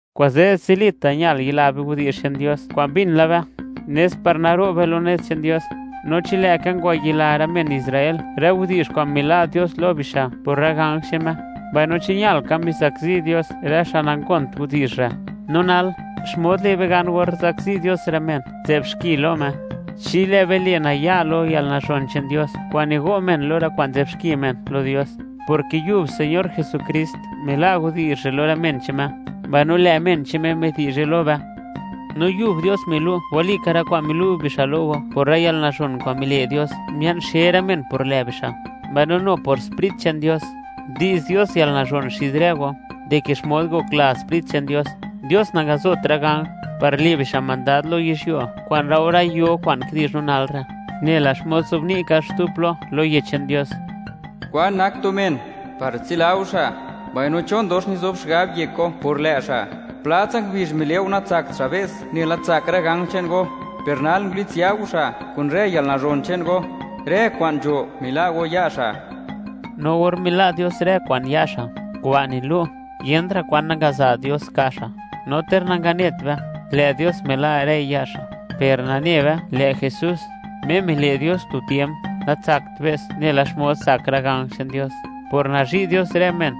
Kuze' zilita' ñal yila be widi'zh che'n Dios kwa'n mbin la be; nes par naro' be lo nez che'n Dios. No chi lë'ka ngwayila rë men Israel rë widi'zh kwa'n mila' Dios lo bixa' por rë ganj che'n Me, mbaino chi ñal ka mizakzi Dios rë xa' nangont widi'zh re', no nal, ¿xmod le' be gan or zakzi Dios rë men nzë'b xki lo Me, chi lë' be le' naya' lo yalnazhon che'n Dios kwa'n nigo' men lo rë kwa'n nzë'b xki men lo Dios? Porke yub Señor Jesukrist mila' widi'zh re' lo rë men che'n Me, mbaino lë' men che'n Me midi'zhe lo be. No yub Dios milu' walika rë kwa'n milu' bixa' lo go por rë lo yalnazhon kwa'n mile' Dios mia'n xe rë men por lë' bixa'. Mbaino nu por Sprit che'n Dios, ndi'z Dios yalnazhon xid rë go, dike xmod ngokla Sprit che'n Dios. Dios nangazot rë ganj, par le' bixa' mandad lo yizhyuo kwa'n laore yo kwa'n kidi'zh no nal re'. Nela xmod nzobni' ka xtu plo lo Yech che'n Dios: ¿Kwan nak tu men, par tsila go xa'?; mbaino, ¿chon dox nizob xigab yek go por lë' xa'? Pla tsa ngubizh mile' go natsakt xa' be's nela tsak rë ganj che'n go, per nal ngulitsya go xa' kun rë yalnazhon che'n go. Rë kwa'n nzho mila' go ya' xa'. No or mila' Dios rë kwa'n ya' xa', kuba' nilu', yent ra' kwan nangaza' Dios ka' xa', no ter nagat ne be, lë' Dios mila' rëi ya' xa'. Per nane be, lë' Jesús, Me mile' Dios tu tiemp, natsakt be's nela xmod tsak rë ganj che'n Dios. Por nazhi' Dios rë men,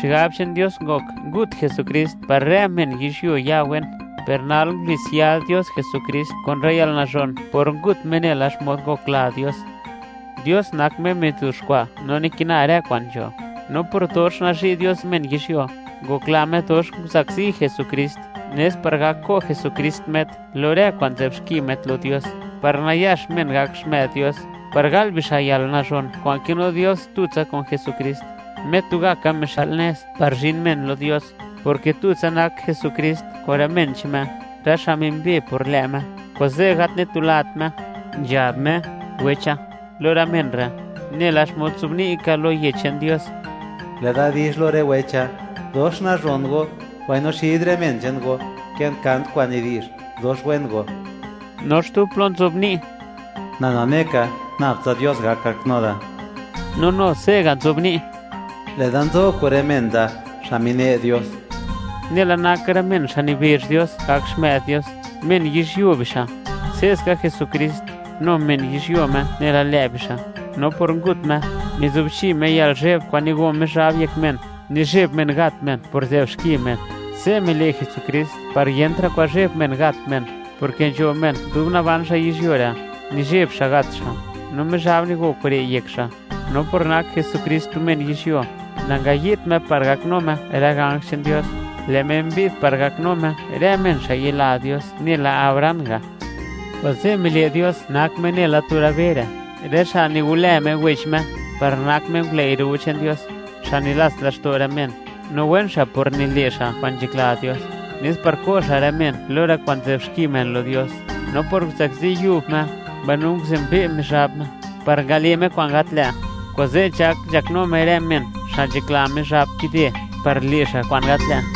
xigab che'n Dios ngok ngut Jesukrist par rë men yizhyuo ya wen, per nal ngulitsya Dios Jesukrist kun rë yalnazhon por ngut Me nela xmod ngokla Dios. Dios nak Me mizuxkwa' no nikina rë kwa'n nzho, no por dox nazhi' Dios men yizhyuo, ngokla Me dox nguzakzi Jesukrist, nes par gak ko' Jesukrist met lo rë kwa'n nzëb xki met lo Dios, par nayax men gak xmë'd Dios, par gal bixa' yalnazhon kwa'n kinu Dios tutsa kun Jesukrist, Me tugaka mixa'l nez par zhin men lo Dios. Porke tutsa nak Jesukrist kun rë men che'n Me, rë xa' mimbe por lë' Me, kuze' gat nitulat Me, nzhab Me: “Wecha”, lo rë men re'. Nela xmod nzobni' ka lo Yech che'n Dios: Lë' Da dizh lo rë wecha, dox nazhon Go, mbaino xid rë men che'n Go, kë'n kant kwa'n nidi'zh dox wen Go. No xtu plo nzobni': Na nane ka, nab tsa Dios gak gaknu da. No nu se'ga' nzobni': Lë'da nzo re' kun rë men da, xa' mine' Dios. Nela nak rë men xa' nibezh Dios gak xmë'd Dios, men yizhyuo bixa'; se'ska Jesukrist, nu men yizhyuo Me nela lë' bixa'; no por ngut Me, mizubchi Me yalnizhe'b kwa'n nigo Mizhab yek men, nizheb men gat men por nzë'b xki men. Se' mile' Jesukrist par yentra' kwan zheb men gat men, porke nzho men dub naban xa' yizhyuo re', nizheb xa' gat xa', no Mizhab nigo kure' yek xa'. No por nak Jesukrist tu men yizhyuo, nangayi'dt Me par gaknu Me rë ganj che'n Dios; lë' Me mbi'd par gaknu Me rë men xa' yila Dios nela Abraham ga', kuze' mile' Dios nak Me nela tu rë be re', rë xa' nigolë Me wech Me, par nak Me ngulëi' ro che'n Dios, xa' nilats laxto' rë men, no wen xa' por nile' xa' kwa'n nzhakla Dios, nes par ko' xa' rë men lo rë kwa'n nzë'b xki men lo Dios. No por nguzakzi yub Me, mbaino nguzenbe' Mizhab Me (miwi' Mizhab xmod nak Me) par ngale' Me kwa'n gat lë', kuze', nzhak nzhaknu Me rë men, xa' nzhakla Mizhab kide, par le' xa' kwa'n gat lë'.